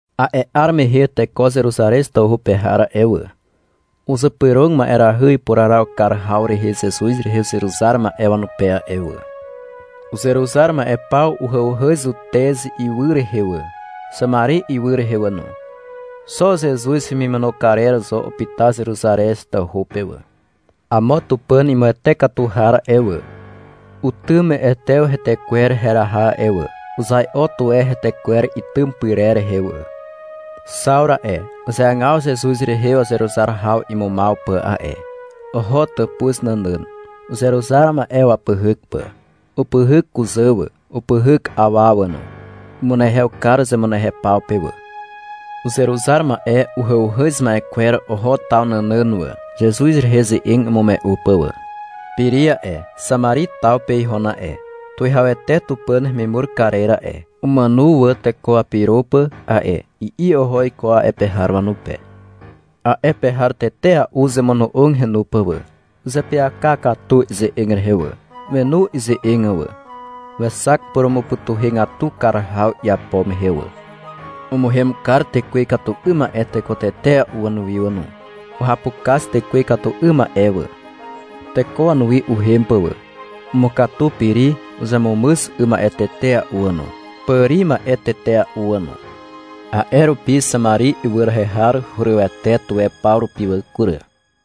A'e 'ar mehe teko Zeruzarez tawhu pe har a'e wà, uzypyrog ma'erahy ipuraraw kar haw rehe Zezuz rehe uzeruzar ma'e wanupe a'e wà. Uzeruzar ma'e paw uhàuhàz Zutez ywy rehe wà, Xamari ywy rehe wà no. Xo Zezuz hemimono karer zo upyta Zeruzarez tawhu pe wà. Amo Tupàn imuwete katu har a'e wà, utym Etew hetekwer heraha a'e wà. Uzai'o tuwe hetekwer itym pyrer rehe wà. Xawru a'e, uzeagaw Zezuz rehe wazeruzar haw imumaw pà a'e. Oho tàpuz nànàn, uzeruzar ma'e wapyhyk pà. Upyhyk kuzà wà, upyhyk awa wà no. Umunehew kar zemunehew paw pe wà. Uzeruzar ma'e uhàuhàz ma'e kwer oho taw nànàn wà, Zezuz rehe ze'eg imume'u pà wà. Piri a'e, Xamari taw pe ihon a'e. — Tuwihawete Tupàn hemimur karer a'e, umàno wà teko wapyro pà a'e, i'i oho iko a'e pe har wanupe. A'e pe har tetea'u uzemono'og henu pà wà. Uzeapyaka katu ize'eg rehe wà. Wenu ize'eg wà. Wexak purumupytuhegatu kar haw iapo mehe wà. Umuhem kar tekwe ikatu 'ym ma'e teko tetea'u wanuwi wà no. Uhapukaz tekwe ikatu 'ym ma'e wà, teko wanuwi uhem pà wà. Umukatu Piri uzemumyz 'ym ma'e tetea'u wà no, pàri ma'e tetea'u wà no. A'e rupi Xamari ywy rehe har hurywete tuwe paw rupi wà kury.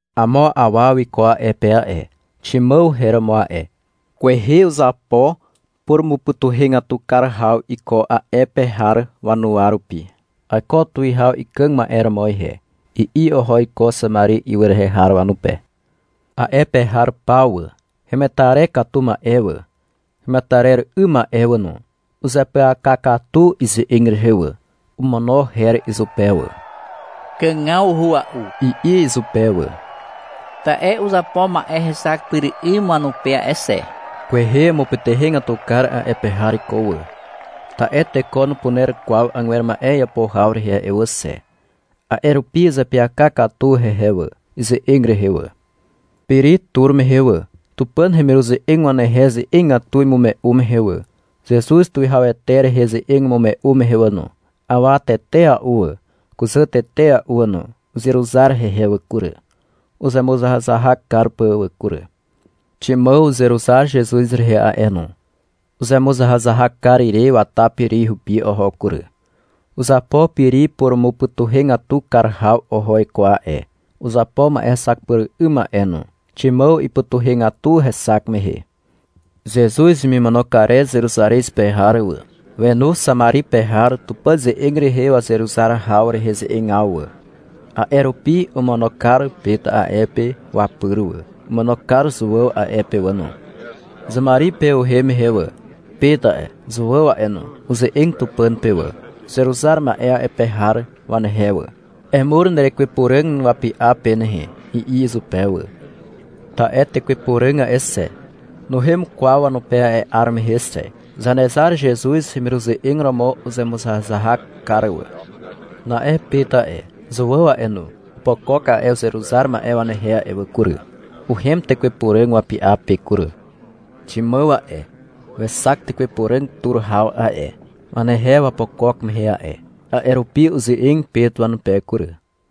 Amo awa wiko a'e pe a'e. Ximàw her romo a'e. Kwehe uzapo purumupytuhegatu kar haw iko a'e pe har wanuwa rupi. — Aiko tuwihaw ikàg ma'e romo ihe, i'i oho iko Xamari ywy rehe har wanupe. A'e pe har paw wà, hemetarer katu ma'e wà, hemetarer 'ym ma'e wà no, uzeapyaka katu ize'eg rehe wà. Omono her izupe wà. — Kàgawhua'u, i'i izupe wà, ta'e uzapo ma'e hexak pyr 'ym wanupe a'e xe. Kwehe umupytuhegatu kar a'e pe har iko wà, ta'e teko nupuner kwaw agwer ma'e iapo haw rehe a'e wà xe. A'e rupi uzeapyaka katu hehe wà, ize'eg rehe wà. Piri tur mehe wà, Tupàn hemiruze'eg wanehe ze'egatu imume'u mehe wà, Zezuz tuwihawete rehe ze'eg imume'u mehe wà no, awa tetea'u wà, kuzà tetea'u wà no, uzeruzar hehe wà kury, uzemuzahazahak kar pà wà kury. Ximàw uzeruzar Zezuz rehe a'e no. Uzemuzahazahak kar ire wata Piri hupi oho kury. Uzapo Piri purumupytuhegatu kar haw oho iko a'e, uzapo ma'e hexak pyr 'ym a'e no. Ximàw ipytuhegatu hexak mehe. Zezuz hemimono karer Zeruzarez pe har wà, wenu Xamari pe har Tupàn ze'eg rehe wazeruzar haw rehe ze'egaw wà. A'e rupi omono kar Pet a'e pe wapyr wà. Omono kar Zuàw a'e pe wà no. Xamari pe uhem mehe wà, Pet a'e, Zuàw a'e no, uze'eg Tupàn pe wà, uzeruzar ma'e a'e pe har wanehe wà. — Emur nerekwe Puràg wapy'a pe nehe, i'i izupe wà. Ta'e Tekwe Puràg a'e xe, nuhem kwaw wanupe a'e 'ar mehe xe. Zanezar Zezuz hemiruze'eg romo uzemuzahazahak kar wà. Na'e Pet a'e, Zuàw a'e no, opokok a'e uzeruzar ma'e wanehe a'e wà kury. Uhem Tekwe Puràg wapy'a pe kury. Ximàw a'e, wexak Tekwe Puràg tur haw a'e, wanehe wapokok mehe a'e. A'e rupi uze'eg Pet wanupe kury.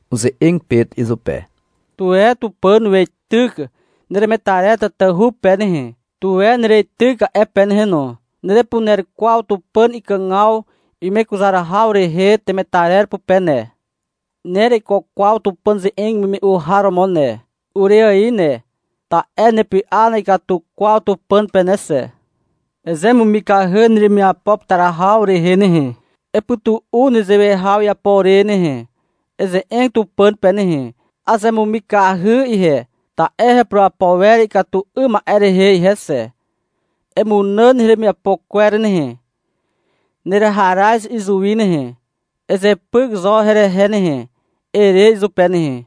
Uze'eg Pet izupe. -Tuwe Tupàn weityk neremetarer tatahu pe nehe, tuwe nereityk a'e pe nehe no. Nerepuner kwaw Tupàn ikàgaw imekuzar haw rehe temetarer pupe ne. Nereiko kwaw Tupàn ze'eg imume'u har romo ne, ure ài ne, ta'e nepy'a na'ikatu kwaw Tupàn pe ne xe. Ezemumikahy neremiapo putar haw rehe nehe. Epytu'u nezewe haw iputar ire nehe. Eze'eg Tupàn pe nehe. — Azemumikahy ihe, ta'e hepurapo wer ikatu 'ym ma'e rehe ihe xe. Emunàn heremiapo kwer nehe, nereharaz izuwi nehe, ezepyk zo herehe nehe, ere izupe nehe.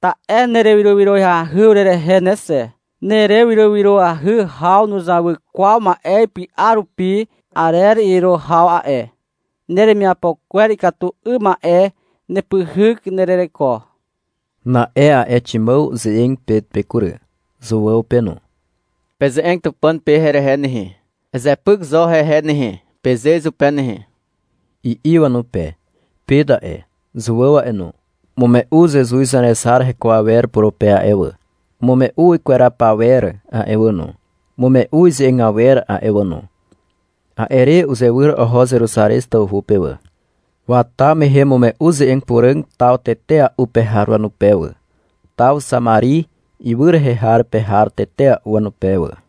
Ta'e nerewyrowyroahy urerehe ne xe. Nerewyrowyroahy haw nuzawy kwaw ma'e ipy'a rupi arer iro haw a'e. Neremiapo kwer ikatu 'ym ma'e nepyhyk nerereko. Na'e a'e Ximàw uze'eg Pet pe kury, Zuàw pe no. — Peze'eg Tupàn pe herehe nehe. -Ezepyk zo hehe nehe, peze izupe nehe, i'i wanupe. Pet a'e, Zuàw a'e no, umume'u Zezuz Zanezar heko awer purupe a'e wà, umume'u ikweraw pawer a'e wà no, umume'u ize'eg awer a'e wà no. A'e re uzewyr oho Zeruzarez tawhu pe wà. Wata mehe umume'u ze'eg puràg taw tetea'u pe har wanupe wà, taw Xamari ywy rehe har pe har tetea'u wanupe wà.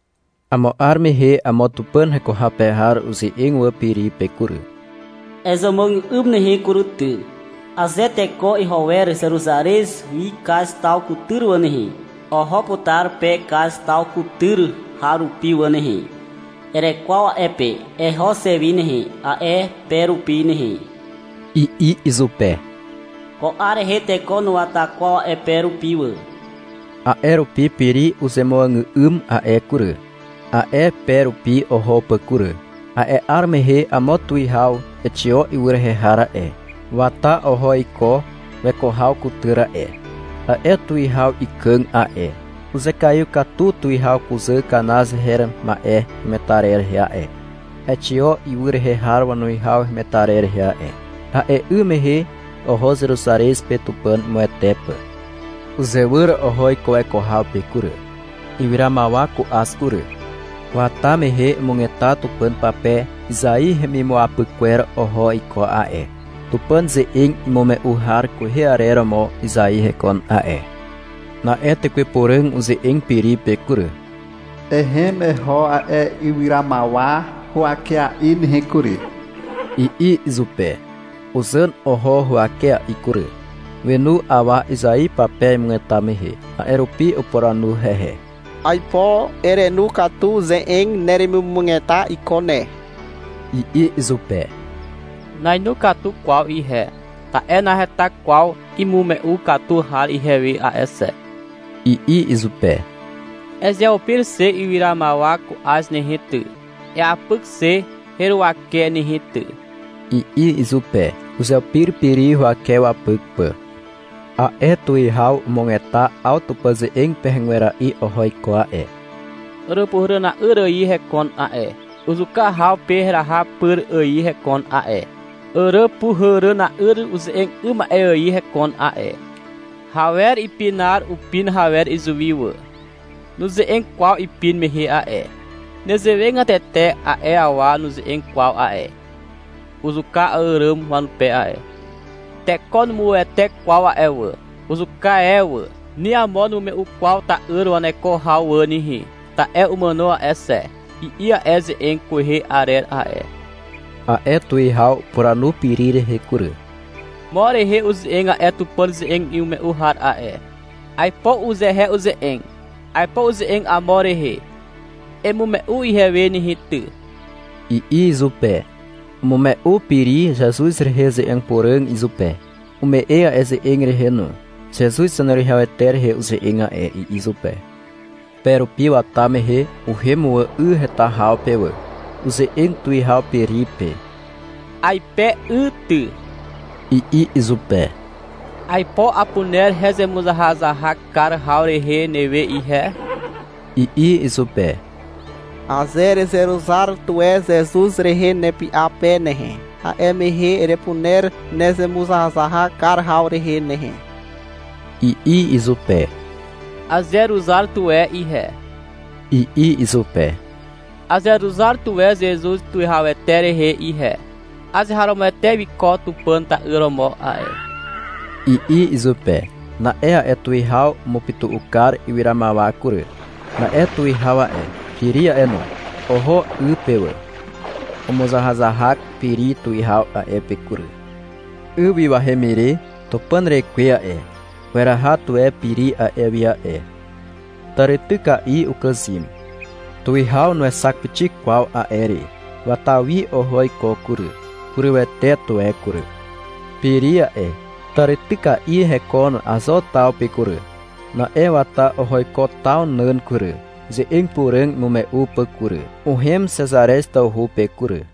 Amo 'ar mehe amo Tupàn heko haw pe har uze'eg wà Piri pe kury. — Ezemuàgà'ym nehe kury ty. Aze teko iho wer Zeruzarez wi Kaz taw kutyr wà nehe, oho putar pe Kaz taw kutyr har rupi wà nehe. Erekwaw a'e pe. Eho xe wi nehe, a'e pe rupi nehe, i'i izupe. (Ko 'ar rehe teko nuwata kwaw a'e pe rupi wà.) A'e rupi Piri uzemuàgà'ym a'e kury, a'e pe rupi oho pà kury. A'e 'ar mehe amo tuwihaw Exio ywy rehe har a'e, wata oho iko weko haw kutyr a'e. A'e tuwihaw ikàg a'e. Uzekaiw katu Tuwihaw kuzà Kanaz her ma'e hemetarer rehe a'e, Exio ywy rehe har wanuwihaw hemetarer rehe a'e. A'e 'ym mehe oho Zeruzarez pe Tupàn imuwete pà. Uzewyr oho iko weko haw pe kury, ywyramawa ku'az kury. Wata mehe umugeta Tupàn pape Izai hemimuapyk kwer oho iko a'e. (Tupàn ze'eg imume'u har kwehe arer romo Izai hekon a'e.) Na'e Tekwe Puràg uze'eg Piri pe kury. -Ehem eho a'e ywyramawa huwakea'i nehe kury, i'i izupe. Uzàn oho huwakea'i kury. Wenu awa Izai pape imugeta mehe. A'e rupi upuranu hehe. — Aipo erenu katu ze'eg neremimugeta iko ne, i'i izupe. — Nainu katu kwaw ihe, ta'e naheta kwaw imume'u katu har ihewe a'e xe, i'i izupe. -Ezeupir xe ywyramawa ku'az nehe ty, eapyk xe heruwake nehe ty, i'i izupe. Uzeupir Piri huwake wapyk pà. A'e tuwihaw umugeta 'aw Tupàn ze'eg pegwera'i oho iko a'e. Àràpuhàràna'yr ài hekon a'e, Uzuka haw pe heraha pyr ài hekon a'e. Àràpuhàràna'yr uze'eg 'ym ma'e ài hekon a'e. Hawer ipinar upin hawer izuwi wà, Nuze'eg kwaw ipin mehe a'e. Nezewegatete a'e awa nuze'eg kwaw a'e, Uzuka àràm wanupe a'e. Teko numuwete kwaw a'e wà. Uzuka e wà. Ni amo numume'u kwaw ta'yr waneko haw wà nehe. Ta'e umàno a'e xe, i'i a'e ze'eg kwehe arer a'e. A'e tuwihaw upuranu Piri rehe kury. -Mo rehe uze'eg a'e Tupàn ze'eg imume'u har a'e. Aipo uzehe uze'eg. Aipo uze'eg amo rehe. Emume'u ihewe nehe ty, i'i izupe. Umume'u Piri Zezuz rehe ze'eg puràg izupe. Umu'e a'e ze'eg rehe no. — Zezuz Zaneruwihawete rehe uze'eg a'e, i'i izupe. Pe rupi wata mehe uhem wà 'y heta haw pe wà. Uze'eg tuwihaw Piri pe. — Aipe 'y ty, i'i izupe. — Aipo apuner hezemuzahazahak kar haw rehe newe ihe, i'i izupe. — Aze erezeruzar tuwe Zezuz rehe nepy'a pe nehe, a'e mehe erepuner nezemuzahazahak kar haw rehe nehe, i'i izupe. — Azeruzar tuwe ihe, i'i izupe. — Azeruzar tuwe Zezuz tuwihawete rehe ihe. Azeharomoete wiko Tupàn ta'yr romo a'e, i'i izupe. Na'e a'e tuwihaw umupytu'u kar ywyramawa kury. Na'e tuwihaw a'e, Piri a'e no, oho 'y pe wà. Umuzahazahak Piri tuwihaw a'e pe kury. 'Y wi wahem ire Tupàn rekwe a'e, weraha tuwe Piri a'e wi a'e. Tàrityka'i ukàzym. Tuwihaw nuexak pixik kwaw a'e re. Wata wi oho iko kury. Hurywete tuwe kury. Piri a'e, tàrityka'i hekon Azo taw pe kury. Na'e wata oho iko taw nàn kury, ze'eg puràg imume'u pà kury. Uhem Xezarez tawhu pe kury.